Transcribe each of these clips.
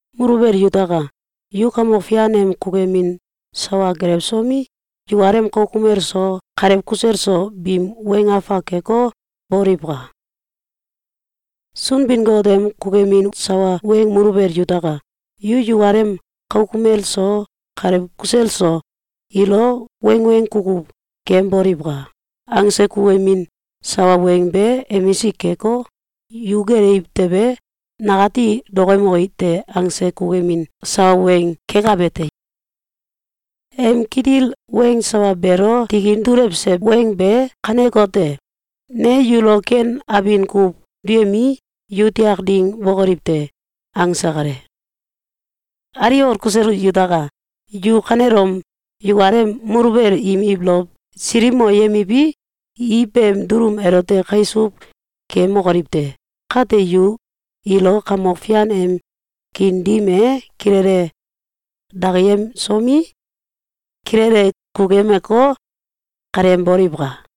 Muluwel yutaka! Yu Kamok Fian em kukuyemin sawa gelewsomi, yukalem kauk kumel so, kalew kusel so, biim weng afak keko, boliwka! Sunbin-Got em kukuyemin sawa weng “Muluwel yutaka! Yu yukalem kauk kumel so, kalew kusel so, ilo wangweng kukuw keyemboliwka!”, angse kukuyemin sawa weng be emisik keko, “Yu gelewiw tewe, nakati dokoyemoki te!”, angse kukuyemin sawa weng kekabe te. Em kitil weng sawa beelo tikin dulewse weng be kanekote: “Ne yulo ken abin kuw duyemii, yu tiak ding bokoliw te!”, angse kale. Aliwol kusel yutaka! Yu kanelom yukalem muluwel im ibolow silikmoyemiwi, i beem dulum elote kaisuw keyemokoliw te! Kate yu ilo Kamok Fian em kiin dim e kilele dakiyemsomi, kilele kukuyemeko, kaleyemboliwka!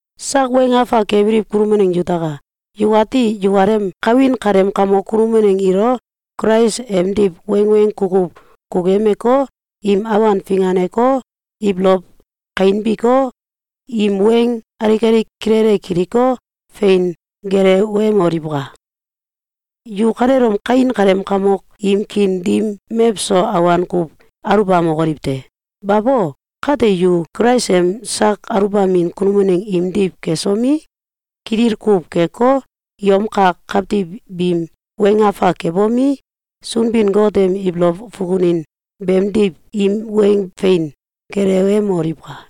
Sak weng afak kebiliw kunum waneng yutaka! Yukati yukalem kawin kaleem kamok kunum waneng ilo Kulais emdiw wangweng kukuw kukuyemeko, im awan finganeko, ibolow kainbiko, im weng alik alik kilele kiliko, fein gelewemoliwka! Yu kanelom kawin kaleem kamok im kiin dim mewso awan kuw aluwbamokoliw te! Bayo! Kate, yu Kulais em sak aluwbamin kunum waneng imdiw kesomi, kitil kuw keko, yom kak kawtiw biim weng afak kebomi, Sunbin-Got em ibolow fukunin beemdiw im weng fein gelewemoliwka!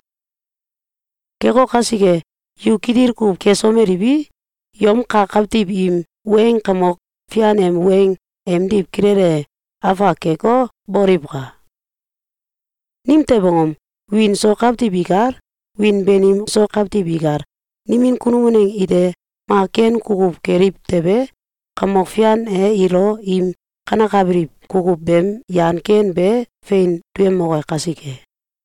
Keko kasike, yu kitil kuw kesomeliwi, yom kak kawtiw im weng Kamok Fian em weng emdiw kilele afak keko, boliwka! Nimtew angom? Wiin so kawtiw ikal, wiin banim so kawtiw ikal, nimin kunum waneng ite mak ken kukuw keliw tewe, Kamok Fian e ilo im kanekabiliw kukuw beem yan ken be fein duyemoke kasike.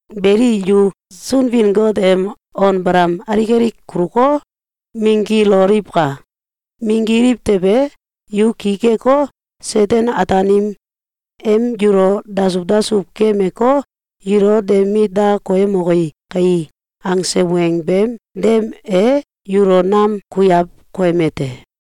Beli, yu Sunbin-Got em on balam alik alik kuluko, minggiloliwka! Minggiliw tewe, yu ki keko, Seten-Ataanim em yulo dasuw dasuw keyemeko, “Yulo de mit da koyemoki kai!”, angse weng beem dem e yulo nam kuiaw koyeme te.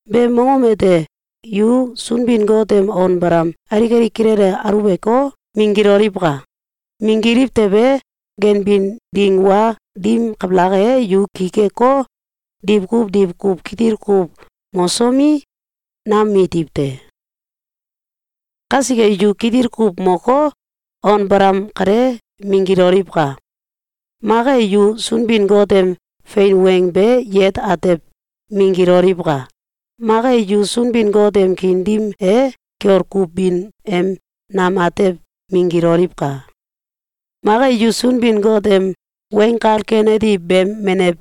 Beem mongom ete yu Sunbin-Got em on balam alik alik kilele aluweko, minggiloliwka! Minggiliw tewe, ganbin ding wa dim kabalak e, yu ki keko, diwkuw diwkuw kitil kuw mosomi, nam mitiw te. Kasike, yu kitil kuw moko, on balam kale minggiloliwka! Mak e, yu Sunbin-Got em fein weng be yewet atew minggiloliwka! Mak e, yu Sunbin-Got em kiin dim e kiol kuw bin em nam atew minggiloliwka! Mak e, yu Sunbin-Got em Weng Kal Ken Ati beem menew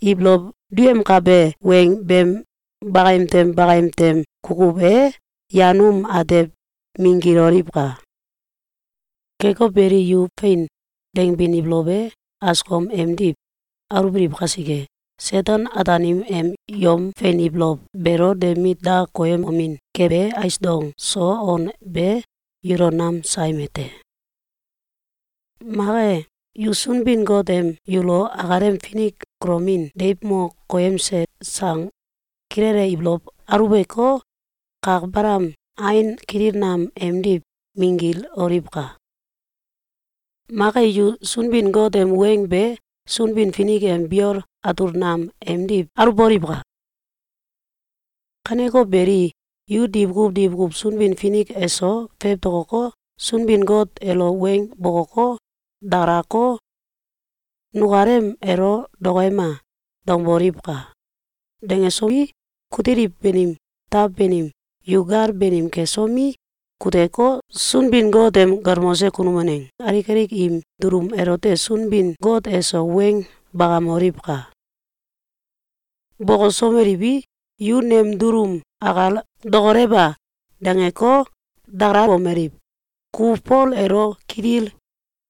ibolow duyemkabe weng beem bakayem tem bakayem tem kukuw e yan aom atew minggiloliwka! Keko beli, yu “Fein!”, dangbin ibolow e askom emdiw aluwbiliw kasike, Seten-Ataanim em yom fein ibolow beelo de mit da koyemomin kebe ais dong so on be yulo nam sayemiw te. Mak e, yu Sunbin-Got em yulo akalem finik kulamin deiw mo koyemse sang kilele ibolow aluweko, kak balam ain kitil nam emdiw minggiloliwka! Mak e, yu Sunbin-Got em weng be Sunbin-Finik em biol atul nam emdiw aluwboliwka! Kaneko beli, yu diwkuw diwkuw Sunbin-Finik eso fewtokoko, Sunbin-Got elo weng bokoko, dakalako, “Nukalem elo dokoyema!”, dangboliwka! Dangesomi, kutiliw banim taw banim, yu gal banim kesomi, kuteko, Sunbin-Got em galmose kunum waneng alik alik im dulum elote Sunbin-Got eso weng bakamoliwka! Bokosomeliwi, yu nem dulum akal “Dokolewa!”, dangeko, dakalalomeliw: “Ku Fol elo kitil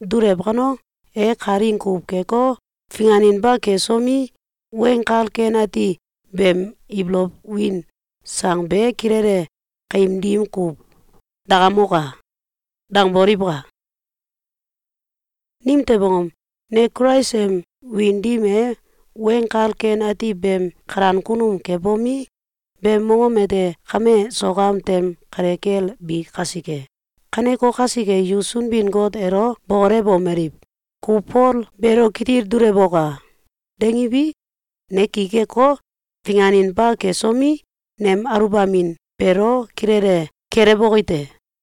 dulew kano, e kalaing kuw keko, finganinba kesomi, Weng Kal Ken Ati beem ibolow win sang be kilele kaim dim kuw dakamoka!”, dangboliwka! Nimtew angom? Ne Kulais em wiin dim e Weng Kal Ken Ati beem kalan kunum kebomi, beem mongom ete kame sok am tem kale kel bi kasike. Kaneko kasike, yu Sunbin-Got elo bokolewomeliw: “Ku Fol beelo kitil dulewoka!”, dangiwi, ne ki keko, finganinba kesomi, nem aluwbamin beelo kilele kelewboki te.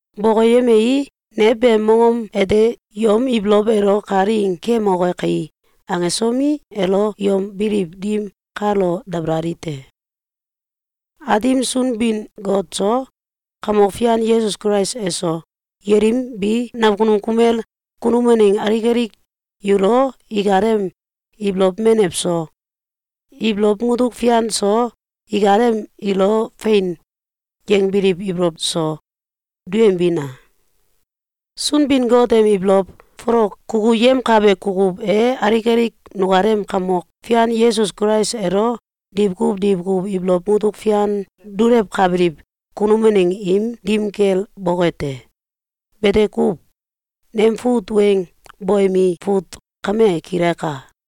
Bokoyemei, ne beem mongom ete “Yom ibolow elo kalaing keyemoke kai!”, angesomi, elo yom biliw dim kalo dabalali te. Aatim Sunbin-Got so, Kamok Fian Yesus Kulais eso, yelim bi nakunum kumel kunum waneng alik alik yulo ikalem ibolow menew so, ibolow mutuk fian so, ikalem ilo “Fein!”, yangbiliw ibolow so, duyembina! Sunbin-Got em ibolow folok kukuyemkabe kukuw e alik alik nukalem Kamok Fian Yesus Kulais elo diwkuw diwkuw ibolow mutuk fian dulewkabiliw kunum waneng im dim kel boke te! Bete kuw. Nem fut weng boyemi fut kame kilaka.